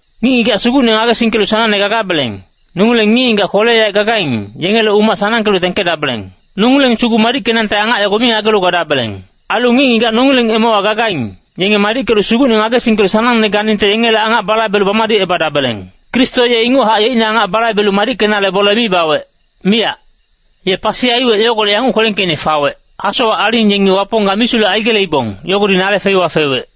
Ngic-ngigac Sugucne ngagesingkelu sanangne gagabeleng, nongileng ngic-ngigac kwele-yaec gagaing, yengele umac sanangkelu tengkedabeleng. Nongileng sugu madickenangte angac yogo mi ngagelu gadabeleng. Ailu ngic-ngigac nongileng emewa gagaing, yenge madickelu Sugucne ngagesingkelu sanangne ganingte yengele angac balaibelu bamadicebadabeleng. Kristo ye inguchac yeicne angacine balaibelu madickenale bole mi bawec, miyac. Ye pasi aiwec yogolec yanguc kwelengkeicne fagac, “Hasowac aling yengi Wapong ga misulec aigeleibong, yogodi nale feiwa fewec.”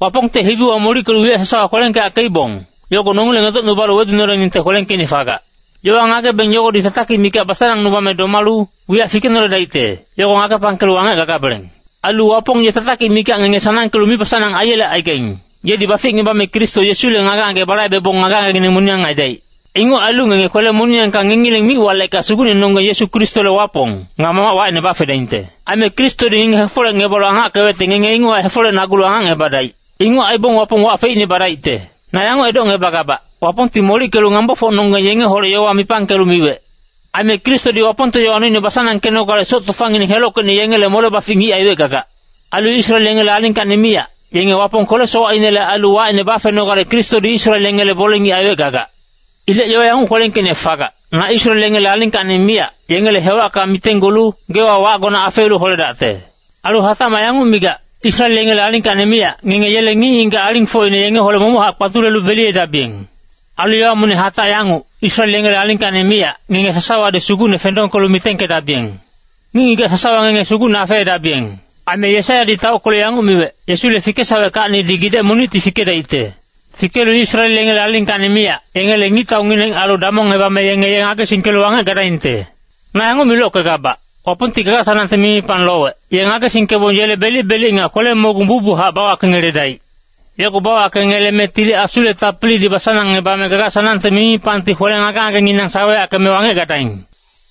Wapongte hibiwa molickelu wiyac sasawa kwelengkeyackeibong, yogo nongileng edocnubalu wedunoleningte kwelengkeicne fagac. Yowa ngagebeng yogodi tatakic mikac basanangnubame domalu, wiyac fikenoledaicte, yogo ngagepangkelu wangec gagabeleng. Ailu Wapong ye tatakic mikac ngenge sanangkelu mibasanang aingelecaigac, yedi baficngebame Kristo Yesule ngage-ngage balaibebong ngage-ngagengineng moniyang aidaic. Inguc ailu ngenge kwele-moniyangka ngengileng mic-walecka Sugucnenonggeng Yesu Kristole Wapong, nga Mamac wacine bafedaingte. Aime Kristodi ngenge hefolecngebalu angackewecte ngenge inguchac hefolecnagulu angacngebadaic. Inguc aibong Wapong wac feicne badaicte. Na yanguc edocngebagabac, Wapongti molickelu ngambofocnonggeng yengeholec yowa mipangkelu miwec. Aime Kristodi Wapongte yowa noine basanangkenogale soc tofangineng helockeicne yengele mole-bafic ngic aiwec gagac. Ailu Israel yengele alingkacni miyac, yenge Wapong kwele-sowacinele ailu wacine bafenogale Kristodi Israel yengele bole-ngic aiwec gagac. Ilec yowa yanguc kwelengkeicne fagac, “Ilec na Israel yengele alingkacni miyac, yengele hewacka mitenggulu, geewa wacgone afeelu holedacte.” Ailu hatacmac yanguc migac, “Israel yengele alingkacni miyac, ngenge yele ngic-ngigac alingfocine yengeholec momochac kpatulelu beliyedabiyeng.” Ailu yowa monic hatac yanguc, “Israel yengele alingkacni miyac, ngenge sasawadi Sugucne fendongkelu mitengkedabiyeng. Ngic-ngigac sasawa ngenge Sugucne afeedabiyeng.” Aime Yesaiyadi taockelu yanguc miwec, “Yesile fikesaweckacnidi gidec monicti fikedaicte. Fikelu Israel yengele alingkacni miyac, yengele ngictaungineng ailu damongebame yenge ye ngagesingkelu wangec gadaingte.” Na yanguc milockegabac, Wapongti gaga-sanangte mimipang lowec, ye ngagesingkebong yele belic-belic nga kwele-mogung bucbuchac bawakengeledaic. Yogo bawakengeleme Tili Asule tapilidi basanangngebame gaga-sanangte mimipangti kwele ngage-ngagenginang saweyackeme wangec gadaing.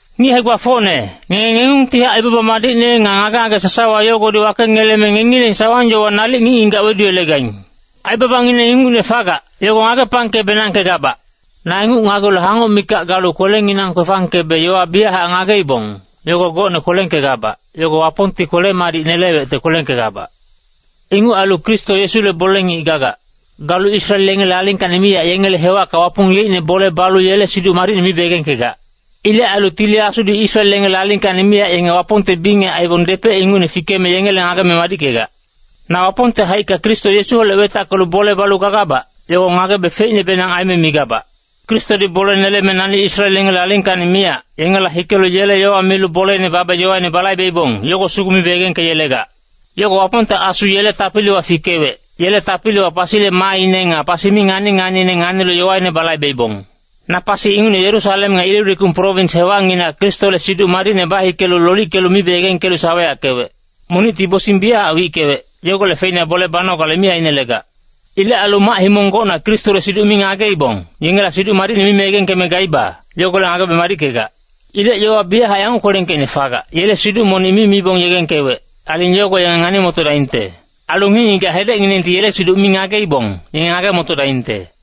Ngic hae-gbafocne, ngenge ngengungtihac aibaba madicne nga ngage-ngage sasawa yogodi wakengeleme ngengileng sawang-yowa nalic ngic-ngigac weduyelegaing. Aibabangineng ingucne fagac, yogo ngagepangke-benangkegabac. Na inguc ngagelu hangoc mikac galu kwelenginang kwefangkebe yowa biyachac ngageibong, yogo gocne kwelengkegabac, yogo Wapongti kwele-madic nelewecte kwelengkegabac. Inguc ailu Kristo Yesule bole-ngic gagac. Galu Israel yengele alingkacni miyac yengele hewacka Wapong yeicne bole balu yele Siduc Madicne mibe yegengkegac. Ilec ailu Tili Asudi Israel yengele alingkacni miyac yenge Wapongte bingec aibong depec ingucne fikeme yengele ngageme madickegac. Na Wapongte haicka Kristo Yesuholec wetackelu bole balu gagabac, yogo ngagebe feicnebenang aime migabac. Kristodi bole neleme nani Israel yengele alingkacni miyac, yengela hikelu yele yowa milu boleine babe yowaine balaibeibong, yogo sugu mibe yegengkeyelegac. Yogo Wapongte Asu yele tapiliwa fikewec, yele tapiliwa pasile maaine nga pasi mi ngani-nganiine nganilu yowaine balaibeibong. Na pasi ingucne Yerusalem nga Ilirikum prowins hewacnginac Kristole Siduc Madicne bahikelu lolickelu mibe yegengkelu saweyackewec. Monicti bosing biyachac wickewec, yogolec feina bole banogale mi ainelegac. Ilec ailu mac-himong gocna Kristole siduc mi ngageibong, yengela Siduc Madicne mime yegengkeme gaiba, yogolec ngagebe madickegac. Ilec yowa biyachac yanguc kwelengkeicne fagac, “Yele siduc monic mi mibong yegengkewec, aling yogo yenge ngani-motodaingte. Ailu ngic-ngigac hedecnginengti yele siduc mi ngageibong, yenge ngage-motodaingte.”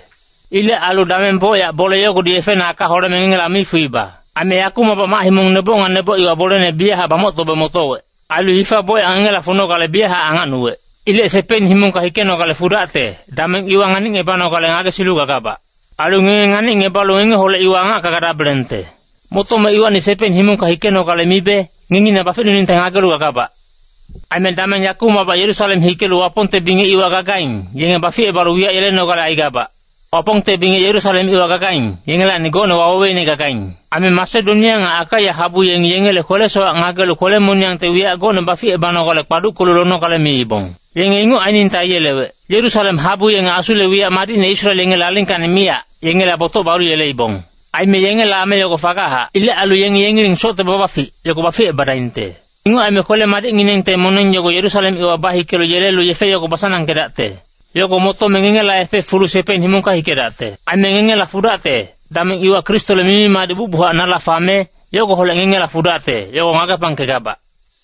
Ilec ailu dameng bocyac bole yogodi yefena aka holeme ngengela mi fuiba. Aime yakumacbac mac-himong neboc nga neboc iwa bolene biyachac bamoctobe motowec. Ailu hifa bocyac ngengela funogale biyachac angacnuwec. Ilec Sepein himongka hikenogale fudacte, dameng iwa nganicngebanogale ngagesilu gagabac. Ailu ngenge nganicngebalu ngengeholec iwa angacka gadabelengte. Motome iwacni Sepein himongka hikenogale mibe, ngengi na baficnuningte ngagelu gagabac. Aime dameng yakumacbac Yerusalem hikelu Wapongte bingec iwa gagaing, yenge baficebalu wiyac yelenogale aigabac. Wapongte bingec Yerusalem iwa gagaing, yengelacni gocne waweweine gagaing. Aime Masedonia nga Akaia habu yengi yengele kwele-sowac ngagelu kwele-moniyangte wiyac gocne baficebanogale kpaduckelu lonogale miibong. Yenge inguc ainingte aiyelewec. Yerusalem habu yenge Asule wiyac madicne Israel yengele alingkacni miyac, yengela botoc balu yeleibong. Aime yengele ame yogo fagachac. Ilec ailu yenge yengileng socte babafic, yogo baficebadaingte. Inguc aime kwele-madicnginengte moneng yogo Yerusalem iwa bahikelu yelelu yefe yogo basanangkedacte. Yogo motome ngengela yefe fulu Sepein himongka hikedacte. Aime ngengela fudacte, dameng iwa Kristole mimi-madic bucbuchac nala fame, yogoholec ngengela fudacte, yogo ngagepangkegabac.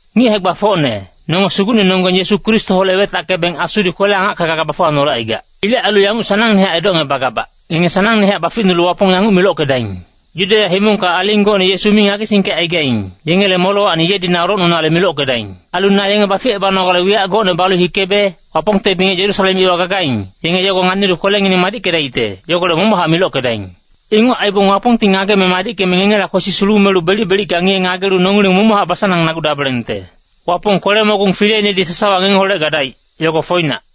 Ngic hae-gbafocne, nonge Sugucnenonggeng Yesu Kristoholec wetackebeng Asudi kwele-angacka gaga bafuwanolecaigac. Ilec ailu yanguc sanangne edocngebagabac, ngenge sanangnehac baficnulu Wapong yanguc milockedaing. Yudeya himongka aling gocne Yesu mi ngagesingkecaigaing, yengele molewacni yedi na olocnunale milockedaing. Ailu na yenge baficebanogale wiyac gocne balu hikebe, Wapongte bingec Yerusalem iwa gagaing, yenge yogo nganilu kwelengineng madickedaicte, yogolec momochac milockedaing. Inguc aibong Wapongti ngageme madickeme ngengela kwesi sulumelu belic-belicka ngiye-ngagelu nongileng momochac basanang-nagudabelengte. Wapong kwele-mogung fileinedi sasawa ngengeholec gadaic, yogo foinac.